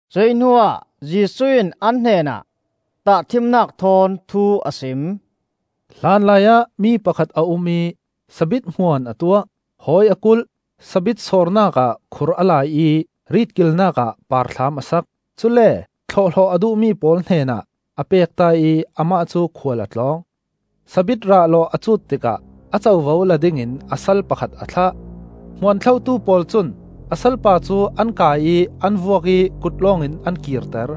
Cuih hnuah Jesuh in an hnenah tahṭhimnak thawn thu a sim. “Hlanlaiah mi pakhat a um ih sabit hmuan a tuah; hawi a kulh, sabit sawrnak ah khur a lai ih rit kilnakah parthlam a sak. Cule thlawhhlawh a duhmi pawl hnenah a pekta ih amah cu khual a tlawng. Sabit rah lawh a cut tikah a covo la dingin a sal pakhat a thlah. Hmuan thlotu pawl cun a salpa cu an kai ih an vuak ih kut lawngin an kirter.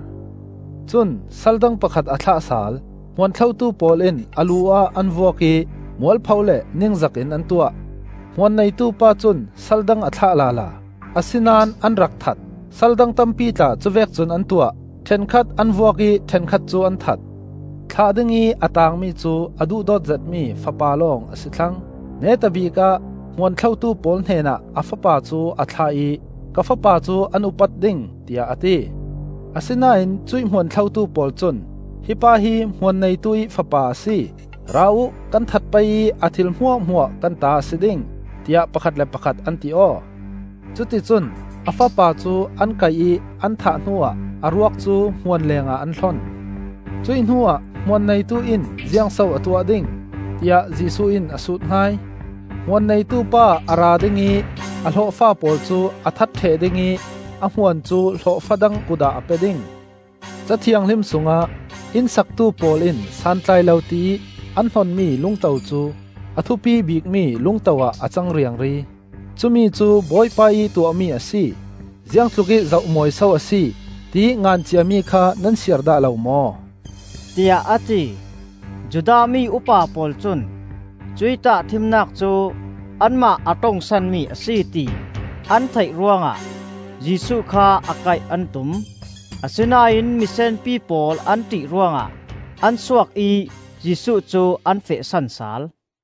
Cun sal dang pakhat a thlah sal. Hmuan thlotu pawl in a lu ah an vuak ih mualpho le ningzak in an tuah. Hmuan neitu pa cun sal dang a thlah lala, a sinan an rak that; sal dang tampi tla cuvek cun an tuah. Ṭhenkhat an vuak ih ṭhenkhat cu an that. Thlah dingih a taangmi cu a duhdawt zetmi fapa lawng a si thlang. Neta bikah hmuan thlotu pawl hnenah a fapa cu a thlah ih, “Ka fapa cu an upat ding,” tiah a ti. Asinain cuih hmuan thlotu pawl cun, “Hi pa hi hmuan neitu ih fapa a si. Ra uh kan that pei ih a thil hmuahhmuah kan ta a si ding,” tiah pakhat le pakhat an ti aw. Cuti cun a fapa cu an kaih ih an thah hnuah a ruak cu hmuan lengah an hlon. “Cuih hnuah hmuan neitu in ziangso a tuah ding?” tiah Jesuh in a sut hai. “Hmuan neitupa a ra ding ih a hlawhfa pawl cu a that ṭheh ding ih a hmuan cu hlawhfa dang kut ah a pe ding. Ca Thianghlim sungah: ‘Inn saktu pawl in santlai lo tiih an hnonmi lungto cu, A thupi bikmi lungto ah a cang riangri. Cumi cu Bawipa ih tuahmi a si; Ziang tlukih zoh mawi so a si,’ tiih ngan ciami kha nan siar dah lo maw?” tiah a ti. Judah mi upa pawl cun cuih tahṭhimnak cu anmah a ṭongsanmi a si, ti an theih ruangah Jesuh kha a kaih an tum. Asinain misenpi pawl an ṭih ruangah an suak ih Jesuh cu an fehsan sal.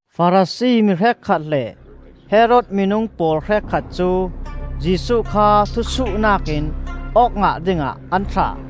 Farasi mi hrekkhat le Herod minung pawl hrekkhat cu Jesuh kha thusuhnak in awk ngah dingah an thlah.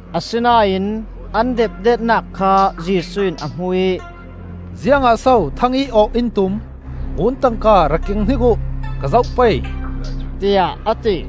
Asinain an depdetnak kha Jesuh in a hmu ih, “Ziangah so thangih awh in tum? Ngun tangka rak keng hnik uh, ka zoh pei,” tiah a ti.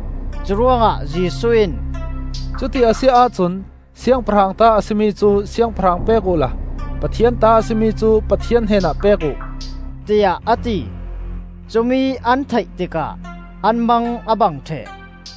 Curuangah Jesuh in, “Cuti a si ahcun siangpahrang ta a si mi cu siangpahrang pek uhla Pathian ta a si mi cu Pathian hnenah pek uh,” tiah a ti. Cumi an theih tikah an mang a bang ṭheh.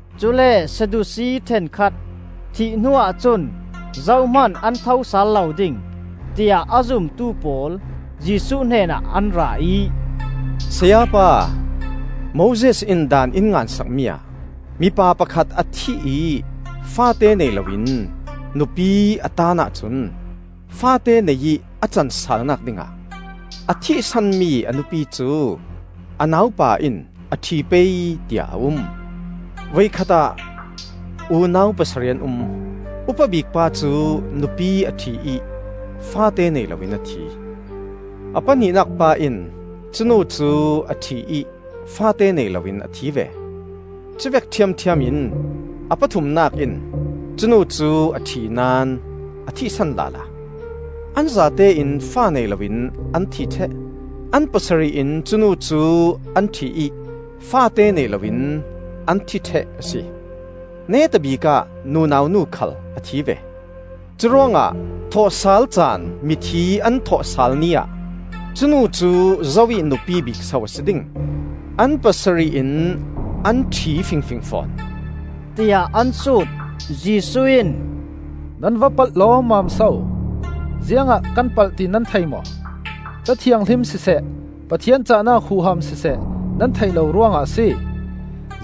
Cule Sadusi ṭhenkhat, thih hnuah cun zohman an thosal lo ding, tiah a zumtu pawl Jesuh hnenah an ra ih, “Sayapa, Moses in daan in ngan sakmi ah ‘Mipa pakhat a thih ih faate nei loin nupi a taan ahcun faate nei ih a can salnak dingah a thihsan mi a nupi cu a naupa in a ṭhi pei,’ tiah a um. Voikhat ah unau pasarih an um; upa bik pa cu nupi a ṭhi ih faate nei loin a thi. A pahnihnak pa in cu nu cu a ṭhi ih faate nei loin a thi ve. Cuvek ṭhiamṭhiam in a pathumnak in cu nu cu a ṭhi naón a thihsan lala. An zatein fa nei loin an thi ṭheh. An pasarih in cu nu cu an ṭhi ih faate nei loin an thi ṭheh a si. Neta bikah nunau nu khal a thi ve. Curuangah thawhsal caan mithi an thawhsal ni ah cu nu cu zo ih nupi bik so a si ding? An pasarih in an ṭhi fingfing fawn,” tiah an sut. Jesuh in, “Nan va palh lawmmam so? Ziangah kan palh ti nan thei maw? Ca Thianghlim siseh, Pathian cahnak huham siseh, nan theih lo ruangah a si.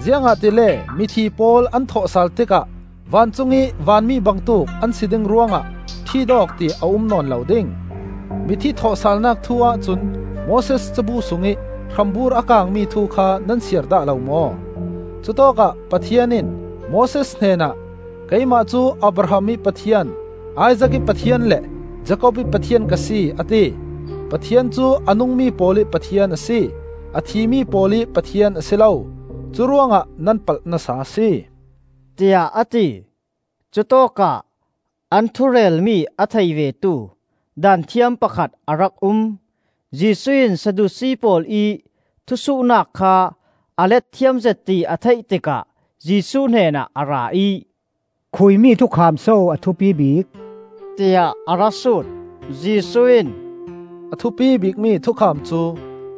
Ziangahtile mithi pawl an thawhsal tikah vancungih vanmi bangtuk an si ding ruangah ṭhit awk ti a um nawn lo ding. Mithi thawhsalnak thu-ah cun Moses Cabu sungih hrambur a kangmi thu kha nan siar dah lo maw? Cutawkah Pathian in Moses hnenah, ‘Keimah cu Abraham ih Pathian, Isaak ih Pathian, le Jakob ih Pathian ka si,’ a ti. Pathian cu a nungmi pawl ih Pathian a si, a thi mi pawl ih Pathian a si lo. Curuangah nan palh nasa a si,” tiah a ti. Cutawkah an thu relmi a thei vetu Daanthiam pakhat a rak um. Jesuh in Sadusi pawl ih thusuhnak kha a let thiam zet ti a theih tikah Jesuh hnenah a ra ih, “Khuimi thukham so a thupi bik?” tiah a ra sut. Jesuh in, “A thupi bikmi thukham cu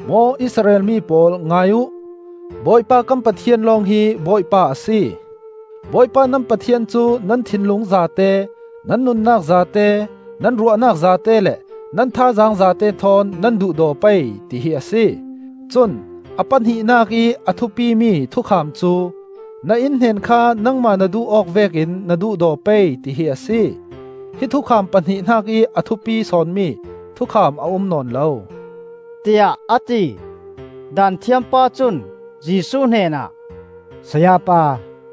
‘Maw Israel mi pawl ngai uh! Bawipa kan Pathian lawng hi Bawipa a si. Bawipa nan Pathian cu nan thinlung zate, nan nunnak zate, nan ruahnak zate le nan thazaang zate thawn nan duhdaw pei,’ tihi a si. Cun a pahnihnak ih a thupimi thukham cu, ‘Na innhnen kha nangmah na duh awk vekin na duhdaw pei,’ tihi a si. Hi thukham pahnih hnakih a thupi sawnmi thukham a um nawn lo,” tiah a ti. Daanthiam pa cun Jesuh hnenah, “Sayapa,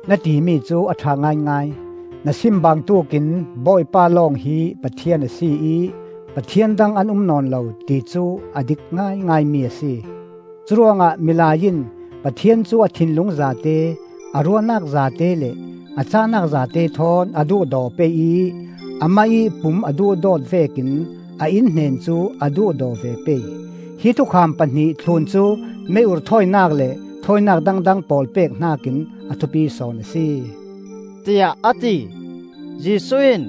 na timi cu a ṭha ngaingai. Na sim bangtuk in Bawipa lawng hi Pathian a si ih pathian dang an um nawn lo, ti cu a dik ngaingaimi a si. Cu ruangah milai in Pathian cu a thinlung zate, a ruahnak zate le a cahnak zate thawn a duhdaw pei ih amah ih pum a duhdawt vekin a innhnen cu a duhdaw ve pei. Hi thukham pahnih thlun cu mei-ur thawinak le thawinak dangdang pawl pek hnakin a thupi sawn a si,” tiah a ti. Jesuh in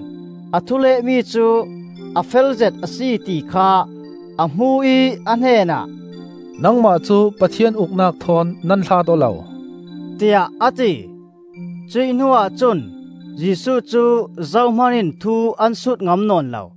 a thu lehmi cu a felzet a si ti kha a hmu ih a hnenah, “Nangmah cu Pathian Uknak thawn nan hlat aw lo,” tiah a ti. Cuih hnuah cun Jesuh cu zohman in thu an sut ngam nawn lo.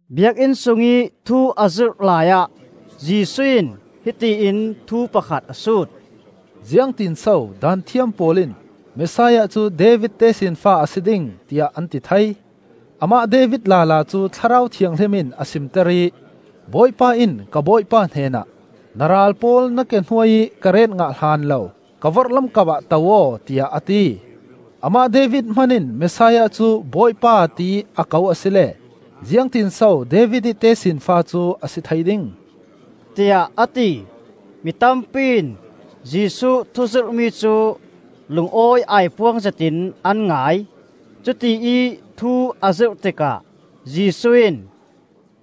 Biakinn sungih thu a zirh laiah Jesuh in hiti in thu pakhat a sut, “Ziangtin so Daanthiam pawl in Messiah cu David tesinfa a si ding, tiah an ti thei? Amah David lala cu Thlarau Thianghlim in a simter ih, ‘Bawipa in ka Bawipa hnenah, Na ral pawl na ke hnuai ih ka ret ngah hlan lo, Ka vorhlam kapah to aw,’ tiah a ti. “Amah David hman in Messiah cu ‘Bawipa,’ tiih a ko asile ziangtinso David ih tesinfa cu a si thei ding,” tiah a ti. Mi tampi in Jesuh thuzirhmi cu lungawi aipuang zetin an ngai. Cutiih thu a zirh tikah Jesuh in,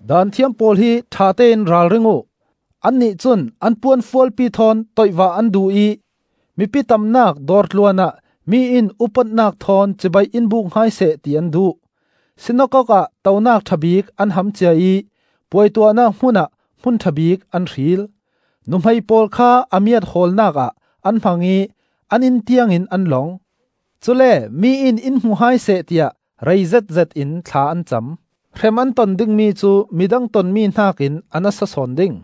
“Daanthiam pawl hi ṭhatein ralring uh. Annih cun an puanfualpi thawn tawihvah an duh ih mipi tamnak dawr tluan ah mi in upatnak thawn cibai in buk hai seh ti an duh. Sinakok ah tonak ṭha bik an ham cia ih puai tuahnak hmun ah hmun ṭha bik an hril. Nuhmei pawl kha a miat hawlnak ah an hmang ih an inn tiangin an lawng. Cule mi in in hmu hai seh tiah rei zetzet in thla an cam. Hrem an ton dingmi cu midang tonmi hnakin a nasa sawn ding,”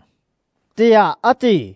tiah a ti.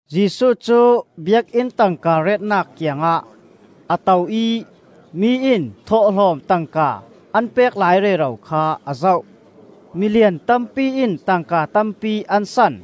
Jesuh cu Biakinn tangka retnak kiangah a to ih mi in thawhlawm tangka an pek lai rero kha a zoh. Milian tampi in tangka tampi an san.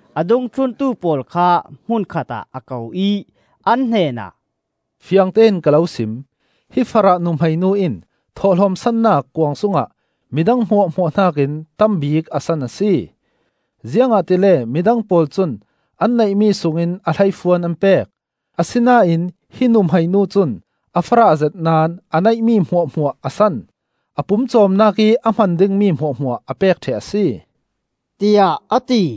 A dungthluntu pawl kha hmunkhat ah a ko ih an hnenah, “Fiangtein ka lo sim: hi farah nuhmei nu in thawhlawm sannak kuang sungah midang hmuahhmuah hnakin tam bik a san a si. Ziangahtile midang pawl cun an neihmi sungin a hleifuan an pek; asinain hi nuhmei nu cun a farah zet naón a neihmi hmuahhmuah a san; a pumcawmnak ih a hman dingmi hmuahhmuah a pek ṭheh a si,” tiah a ti.